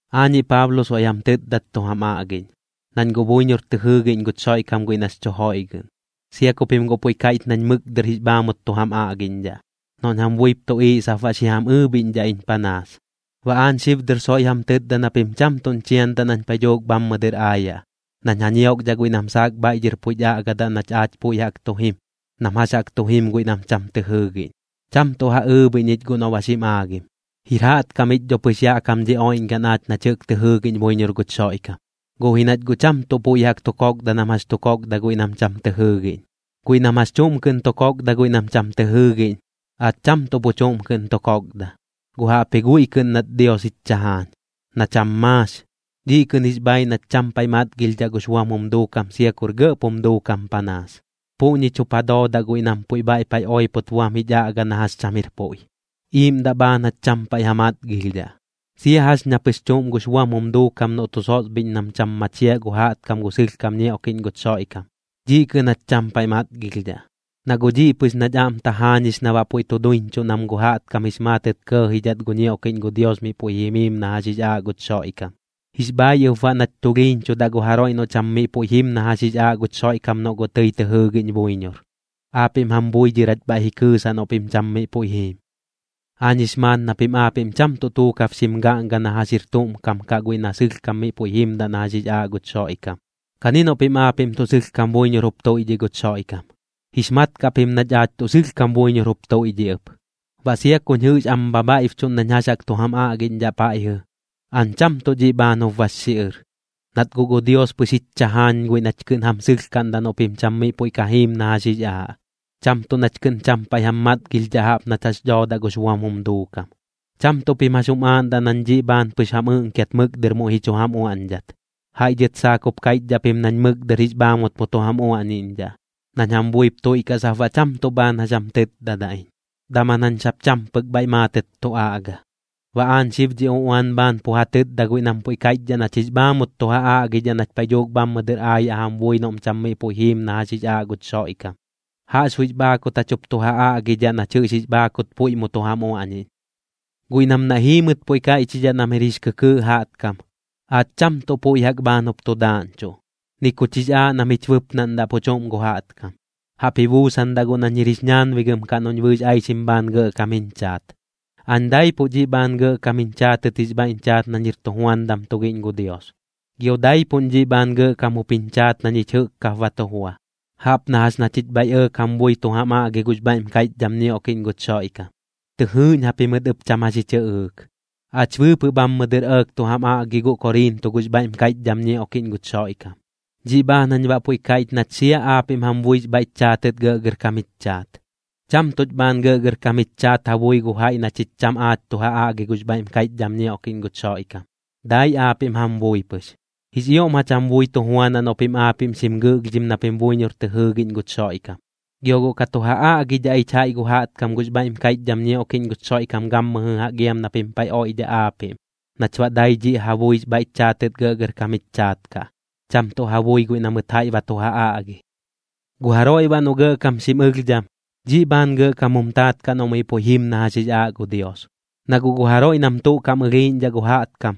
Aañiꞌ Paablo soiꞌ jam tɨtdat tu jam aꞌgiꞌñ, nañ guꞌ buiñor tɨ jɨɨgiꞌñ guch Xoiꞌkam guiꞌ nax chu joiꞌgɨꞌn, sia ku pim guꞌ puiꞌ kaiꞌch nañ mɨk dɨr jix bhaamut tu jam aꞌgiꞌñdhaꞌ, noꞌñ jam buip tuꞌiiꞌ sap baꞌ xi jam ɨɨbhiꞌñdhaꞌ iñ panaas. Baꞌ aañ xib dɨr soiꞌ jam tɨtda na pim cham tuꞌñ chiandaꞌ nañ paiꞌ dhuuk bhammɨ dɨr aayaꞌ, nañ ja ñiokdhaꞌ guiꞌ nam saak bhaiꞌ dhɨr puiꞌch aꞌga nach aach puiꞌ jaꞌk tu jim, nam jax jaꞌk tu jim guiꞌ nam cham tɨ jɨɨgiꞌñ. Cham tuꞌ ja ɨɨbhiꞌñ iñ guꞌ noꞌ ba xim aagim. Jir jaꞌtkam ich dho pɨx yaꞌ kam dhi oiꞌñgaꞌn aach nach jɨꞌk tɨ jɨɨgiꞌñ buiñor guch Xoiꞌkam, guꞌ ji nach guꞌ cham tuꞌ puiꞌ jaꞌk tu kokda nam jax chu kokda guiꞌ nam cham tɨ jɨɨgiꞌñ. Guiꞌ nam jax chuꞌm kɨꞌn tu kokda guiꞌ nam cham tɨ jɨɨgiꞌñ, aach cham tuꞌ pu chuꞌm kɨꞌn tu kokda, guꞌ jaꞌpji guiꞌ kɨꞌn nat Dios jich chajaañ, na cham maax, dhiꞌ kɨꞌn jix bhaaiꞌ nach cham paiꞌ matgilhdhaꞌ gux buam jum duukam sia kur gɇꞌp jum duukam panaas. Puꞌñich jup ja doodaꞌ guiꞌ nam puiꞌ bhaiꞌ paiꞌ oipot buam jich aꞌga na jax cham jir puiꞌ, iiꞌmdaꞌ bhaan jach cham paiꞌ ja matgilhdhaꞌ. Sia jax ña pɨx chuꞌm gux buam jum duukam noꞌ tu sosbhiꞌñ nam cham machiaꞌ gu jaꞌtkam gu sɨlhkam ñioꞌkiꞌñ guch Xoiꞌkam, dhiꞌ kɨꞌn jach cham paiꞌ matgilhdhaꞌ. Na guꞌ dhiꞌ pɨx nach aꞌm tajaañix na baꞌ puiꞌ tu duiñchuꞌ nam gu jaꞌtkam jix maatɨt kɇɇjidhat gu ñioꞌkiꞌñ gu Dios miꞌ puiꞌ jimiim na jax jix aaꞌ guch Xoiꞌkam. Jix bhaaiꞌ ɨp baꞌ nach tulhiiñchudaꞌ gu jaroiꞌ noꞌ cham miꞌ puiꞌ jim na jax jix aaꞌ guch Xoiꞌkam noꞌ guꞌ tɨi tɨ jɨɨgiꞌñ buiñor, aapiꞌm jam bui dhɨr jach bhaiꞌ ji kɨɨsaꞌ noꞌ pim cham miꞌ puiꞌ jiim. Aañ jix maat na pim aapiꞌm cham tuꞌ tuukab xim gaꞌnga na jax jaꞌk jir tuꞌm kam kaꞌ guiꞌ na sɨlhkam miꞌ puiꞌ jimdaꞌ na jax jix aaꞌ guch Xoiꞌkam. Kani noꞌ pim aapiꞌm tuꞌ sɨlhkam buiñor jup tuiꞌdhiꞌ guch Xoiꞌkam, jix mat kaꞌ pim nach aach tuꞌ sɨlhkam buiñor jup tuiꞌdhiꞌ ɨp. Baꞌ sia kuñ jɨꞌx am bhabhaiꞌbchuꞌn nañ jax jaꞌk tu jam aꞌgiꞌñdhaꞌ paiꞌjɨ, aañ cham tuꞌ dhiꞌ bhaan jup bax xiꞌɨr, nat guꞌ gu Dios pɨx jich chajaañ guiꞌ nach kɨꞌn jam sɨlhkaꞌndaꞌ noꞌ pim cham miꞌ puiꞌ ka jiim na jax jix aaꞌ, cham tuꞌ nach kɨꞌn cham paiꞌ jam matgilhdhaꞌ jaꞌp nach jax dhoodaꞌ gux buam jum duukam. Cham tuꞌ pim jax jum aaꞌndaꞌ nañ dhiꞌ bhaan pɨx jam ɨꞌnkiat mɨk dɨr muiꞌ ji chu jam uaꞌñdhat. Jaiꞌ dhɨt saak jup kaiꞌchdhaꞌ pim nañ mɨk dɨr jix bhaamut mu tu jam uaꞌñiꞌñdhaꞌ, nañ jam buip tuiꞌkaꞌ sap baꞌ cham tuꞌ bhaan jax jam tɨtdadaꞌ iñ, daman jañ sap cham pɨk bhaiꞌ maatɨt tu aꞌga. Baꞌ aañ xib dhi uꞌuan bhaan pu ja tɨtda guiꞌ nam puiꞌ kaiꞌchdhaꞌ nach jix bhaamut tu ja aꞌgidhaꞌ nach paiꞌ dhuuk bhammɨ dɨr aayaꞌ jam bui noꞌm cham miꞌ puiꞌ jiim na jax jix aaꞌ guch Xoiꞌkam. Jaꞌxbuiꞌx bhaakut jach jup tu ja aꞌgidhaꞌ nach jɨꞌx jix bhaakut puiꞌ mu tu jam uaꞌñiꞌñ. Guiꞌ nam naiꞌ jiimɨt puiꞌ kaiꞌchidhaꞌ nam jir jix kɨkɨɨꞌ jaꞌtkam, aach cham tuꞌ puiꞌ jaꞌk bhaan jup tu daaꞌñchuꞌ, ni kuch jix aaꞌ nam jich bɨpnaꞌndaꞌ pu chuꞌm gu jaꞌtkam. Jaꞌp ji buusandaꞌ guꞌ nañ jir jix ñaanbigɨm noꞌñ bɨɨx aixim bhaan gɇꞌkam jiñ chaat. Aañ daipuꞌ dhiꞌ bhaan gɇꞌkam jiñ chaatɨt jix bhaiꞌñ chaat nañ jir tujuandam tugiꞌñ gu Dios, gio daipuꞌñ dhiꞌ bhaan gɇꞌkam jup jiñ chaat na ñich jɨꞌk kap ba tu jua, jaꞌp na jax na chich bhaiꞌ ɇɇk jam bui tu jam aꞌgi gux bhaiꞌm kaiꞌchdham ñioꞌkiꞌñ guch Xoiꞌkam, tɨ jɨɨꞌñ japimɨt ɨp cham jax ji chɨꞌɨɨk. Aach bɨɨpɨꞌ bhammɨ dɨr ɇɇk tu jam aꞌgi guꞌ Koriinto gux bhaiꞌm kaiꞌchdham ñioꞌkiꞌñ guch Xoiꞌkam, dhiꞌ bhaan jañ baꞌ puiꞌ kaiꞌch nach sia aapiꞌm jam buix bhaiꞌch chaatɨt gɇꞌgɇrkam jich chaat. Cham tuꞌch bhaan gɇꞌgɇrkam jich chaat ja bui gu jaiꞌ na chich cham aach tu ja aꞌgi gux bhaiꞌm kaiꞌchdham ñioꞌkiꞌñ guch Xoiꞌkam, dai aapiꞌm jam bui pɨx. Jix ioꞌm jach jam bui tu juanaꞌ noꞌ pim aapiꞌm xim gɨꞌlhdhim na pim buiñor tɨ jɨɨgiꞌñ guch Xoiꞌkam. Gio guꞌ ka tu ja aꞌgidhaꞌ ich jaiꞌ gu jaꞌtkam gux bhaiꞌm kaiꞌchdham ñioꞌkiꞌñ guch Xoiꞌkam gammɨjɨ jaꞌk iam na pim paiꞌ oiꞌdhaꞌ aapiꞌm, nach baꞌ dai dhiꞌ ja buix bhaiꞌch chaatɨt gɇꞌgɇrkam jich chaat kaꞌ, cham tuꞌ ja bui guiꞌ na mɨt jaiꞌ ba tu ja aꞌgi. Gu jaroiꞌ baꞌ noꞌ gɇꞌkam xim ɨlhdham, dhiꞌ bhaan gɇꞌkam jum taat kaꞌ noꞌ miꞌ puiꞌ jim na jax jix aaꞌ gu Dios. Na guꞌ gu jaroiꞌ nam tuꞌ kaꞌm ɨlhiiꞌñdhaꞌ gu jaꞌtkam,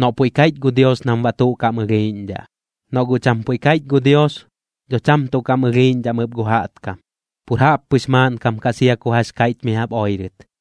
noꞌ puiꞌ kaiꞌch gu Dios nam baꞌ tuꞌ kaꞌm ɨlhiiꞌñdhaꞌ. Noꞌ guꞌ cham puiꞌ kaiꞌch gu Dios, dho cham tuꞌ kaꞌm ɨlhiiꞌñdhaꞌm ɨp gu jaꞌtkam, pur jaꞌppɨx maaꞌnkam kaꞌ sia ku jax kaiꞌch mi jaꞌp oirɨt.